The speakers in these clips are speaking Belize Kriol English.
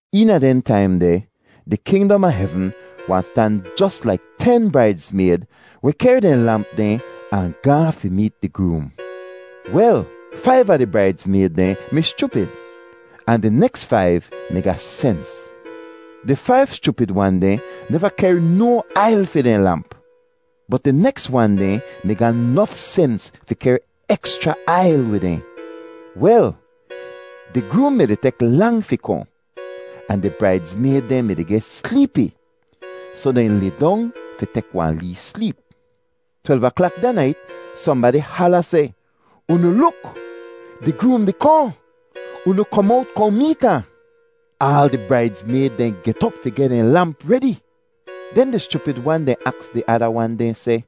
“Eena dehn taim deh di kingdom a hevn wahn stan jos laik ten braidzmayd weh kehr dehn lamp dehn ahn gaahn fi meet di groom. Wel, faiv a di braidzmayd dehn mi schupid, ahn di neks faiv mi ga sens. Di faiv schupid wan dehn neva kehr no ail fi dehn lamp, bot di neks wan dehn mi ga nof sens fi kehr ekschra ail wid dehn. Wel, di groom mi-di tek lang fi kohn, ahn di braidzmayd dehn mi-di geh sleepi, soh dehn lidong fi tek wahn lee sleep. “Twelv aklak da nait sohnbadi hala seh, ‘Unu luk! Di groom di kohn! Unu kom owt, kohn meet ahn.’ “Aal di braidzmayd dehn get op fi geh dehn lamp redi. Den di schupid wan dehn aks di ada wan dehn seh,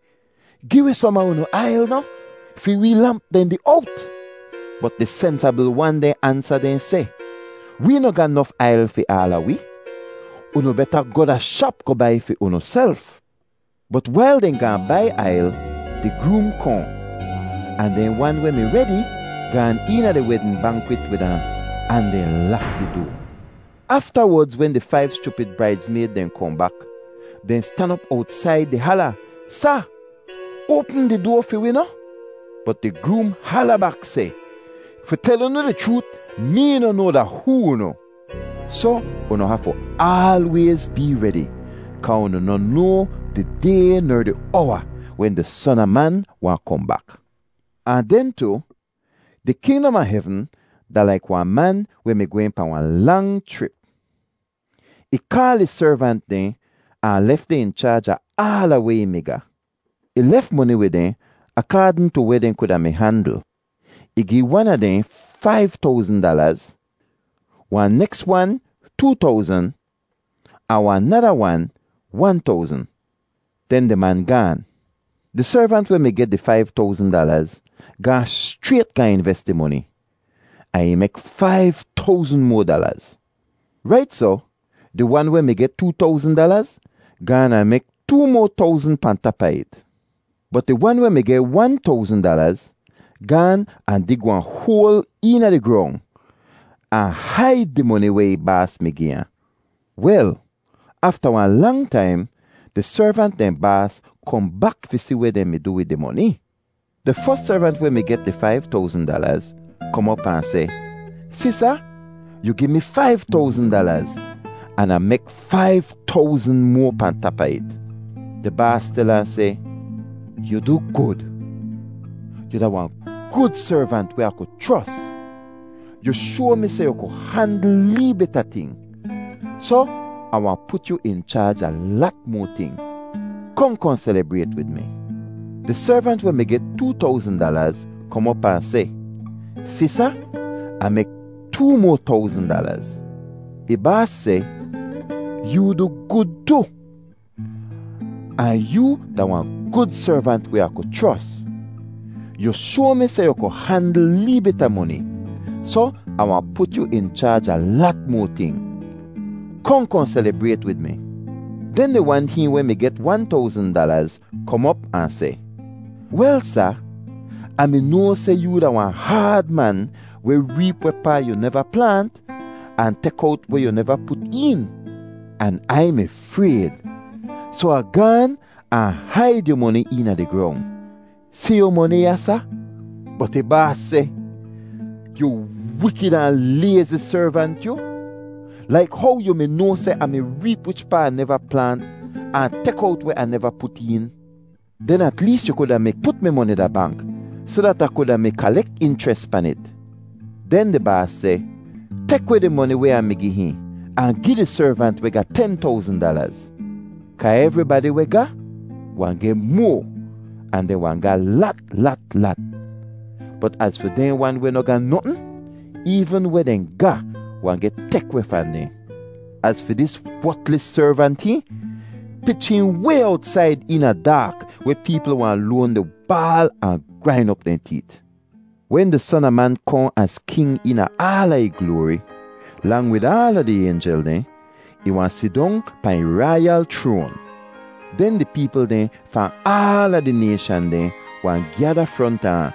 ‘Gi wi som a unu ail noh? Fi wee lamp dehn di owt.’ “Bot di sensabl wan dehn ansa dehn seh, ‘Wee noh ga nof ail fi aala wi. Unu beta goh da shap goh bai fi unuself.’ “Bot wail dehn gaahn bai ail, di groom kohn, ahn dehn wan weh mi redi gaan eena di wedn bankwit wid ahn, ahn dehn lak di doa. Aftawodz wen di faiv schupid braidzmayd dehn kohn bak, dehn stan op owtsaid di hala, ‘Sa! Oapm di doa fi wi noh?’ “Bot di groom hala bak seh, ‘Fi tel unu di chroot, mee noh noa da hoo unu!’ “Soh unu hafu aalwayz bee redi kaa unu noh noa di day ner di owa wen di Son a Man wahn kohn bak. “Ahn den tu, di kingdom a hevn da laik wahn man weh mi gwehn pahn wahn lang chrip. Ih kaal ih servant dehn ahn lef dehn in chaaj a aala weh ih mi ga. Ih lef moni wid dehn akaadn tu weh dehn kuda mi handl. Ih gi wan a dehn faiv towzn dalaz, wahn neks wan too towzn, ahn wahn nada wan, wan towzn. Den di man gaan. Di servant weh mi geh di faiv towzn dalaz gaahn schrayt gaahn inves di moni, ahn ih mek faiv towzn moa dalaz. Rait soh, di wan weh mi geh too towzn dalaz gaan ahn mek too moa towzn pahn tap a it. Bot di wan weh mi geh wan towzn dalaz gaan ahn dig wahn hoal eena di grong ahn haid di moni weh ih baas mi gi ahn. “Wel, afta wahn lang taim di servant dehn baas kohn bak fi si weh dehn mi du wid ih moni. Di fos servant weh mi geh di faiv towzn dalaz kom op ahn seh, ‘Si Sa, yu gi mi faiv towzn dalaz an Ah mek faiv towzn moa pahn tap a it.’ “Di baas tel ahn seh, ‘Yu du gud! Yu da wahn gud servant weh Ah ku chros. Yu shoa mi seh yu ku handl lee bit a ting, soh Ah wahn put yu in chaaj a lat moa ting. Kohn kohn selibrayt wid mi.’ “Di servant weh mi geh too towzn dalaz kom op ahn seh, ‘Si Sa, Ah mek too moa towzn dalaz.’ “Ih baas seh, ‘Yoo du gud tu, ahn yoo da wahn gud servant weh Ah ku chros. Yu shoa mi seh yu ku handl lee bit a moni, soh Ah wahn put yu in chaaj a lat moa ting. Kohn kohn selibrayt wid mi.’ “Den di wan hihn weh mi geh wan towzn dalaz kom op ahn seh, ‘Wel Sa, Ah mi noa seh yoo da wahn haad man weh reep wehpaa yu neva plaant, ahn tek owt weh yu neva put een, an Ai mi frayd, soh Ah gaan ahn haid yu moni eena di grong. Si yu moni ya, Sa.’ “Bot ih baas seh, ‘Yu wikid ahn layzi servant, yu! Laik how yu mi noa seh Ah mi reep wichpaa Ah neva plaant, ahn tek owt weh Ah neva put een, den at lees yu kuda mi put mi moni da bank soh dat Ah kuda mi kalek inchres pan it.’ “Den di baas seh, ‘Tek weh di moni weh Ah mi gi hihn, ahn gi di servant weh ga ten towzn dalaz. Kaa evribadi weh ga, wahn geh moa, ahn dehn wahn ga lat lat lat. Bot az fi dehn wan weh noh ga notn, eevn weh dehn ga wahn geh tek weh fahn dehn. Az fi dis wotlis servant hihn, pich hihn way owtsaid eena daak weh peepl wahn loan di baal ahn grain op dehn teet.’ “Wen di Son a Man kohn az king eena aala ih gloari, lang wid aala di aynjel dehn, ih wahn sidong pahn ih raiyal chroan. Den di peepl dehn fahn aala di nayshan dehn wahn gyada fronta ahn,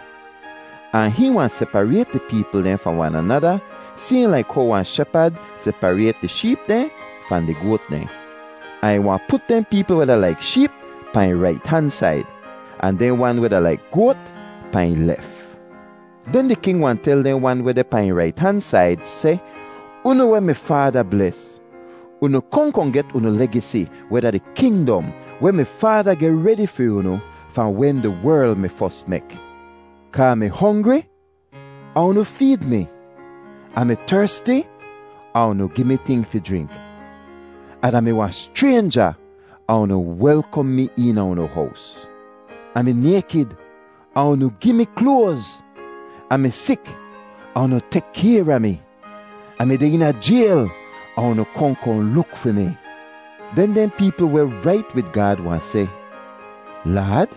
ahn hihn wahn separayt di peepl dehn fahn wan anada sayhn laik how wahn shepad separayt di sheep dehn fahn di goat dehn. Ahn ih wahn put dehn peepl weh da laik sheep pahn ih rait han said, ahn dehn wan weh da laik goat pahn ih lef. “Den di king wahn tel dehn wan weh deh pahn ih rait han said seh, ‘Unu weh mi Faada bles, unu kohn kohn get unu legisi weh da di kingdom weh mi Faada geh redi fi unu fahn wen di werl mi fos mek; kaa Ah mi hongri ahn unu feed mi; Ah mi tersti ahn unu gi mi ting fi jrink; Ah da-mi wahn schraynja ahn unu welkom mi eena unu hows. Ah mi naykid ahn unu gi mi kloaz; Ah mi sik ahn unu tek kayr a mi; Ah mi deh eena jayl ahn unu kohn kohn luk fi mi.’ “Den dehn peepl weh rait wid Gaad wahn seh, ‘Laad,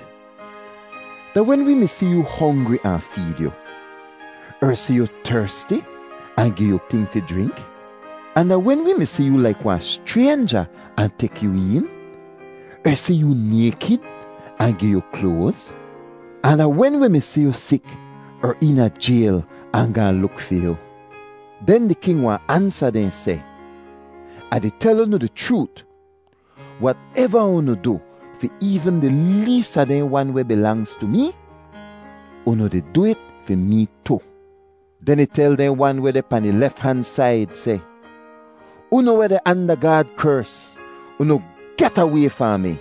da wen wee mi si yoo hongri ahn feed yu, er si yu tersti ahn gi yu ting fi jrink? Ahn da wen wee mi si yu laik wahn schraynja ahn tek yu een, er si yu naykid ahn gi yu kloaz? Ahn da wen wi mi si yu sik er eena jayl ahn gaahn luk fi yu?’ “Den di king wahn ansa dehn seh, ‘Ah di tel unu di chroot, wateva unu du fi eevn di lees a dehn wan weh bilangz tu mee, unu di du it fi mee tu.’ “Den ih tel dehn wan weh deh pahn ih lef han said seh, ‘Unu weh deh anda Gaad kers, unu get away fahn mi!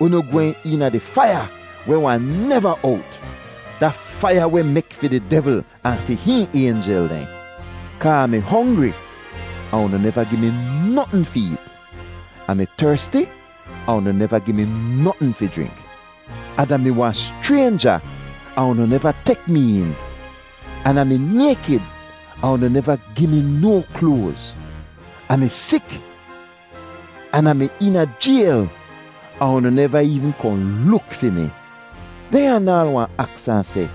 Unu gwehn eena di faiya weh wahn neva owt—da faiya weh mek fi di devl ahn fi hihn aynjel dehn. Kaa Ah mi hongri ahn unu neva gi mi notn fi eet; Ah mi tersti ahn unu neva gi mi notn fi jrink; Ah da-mi wahn schraynja ahn unu neva tek mi een; an Ah mi naykid ahn unu neva gi mi no kloaz; Ah mi sik, an Ah mi eena jayl, ahn unu neva eevn kohn luk fi mi.’ “Dehn anaal wahn aks ahn seh,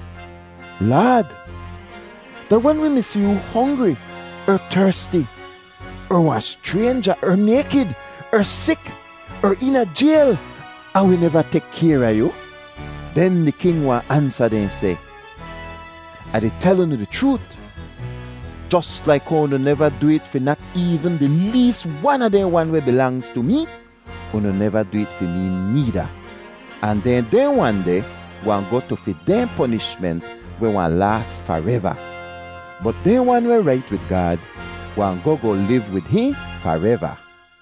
‘Laad, da wen wi mi si yoo hongri er tersti er wahn schraynja er naykid er sik er eena jayl ahn wi neva tek kayr a yu?’ “Den di king wahn ansa dehn seh, ‘Ah di tel unu di chroot, jos laik how unu neva du it fi nat eevn di lees wan a dehn wan weh bilangz tu mee, unu neva du it fi mee needa.’ “Ahn den dehn wan deh wahn goh tu fi dehn ponishment weh wahn laas fareva, bot dehn wan weh rait wid Gaad wahn goh goh liv wid hihn fareva.”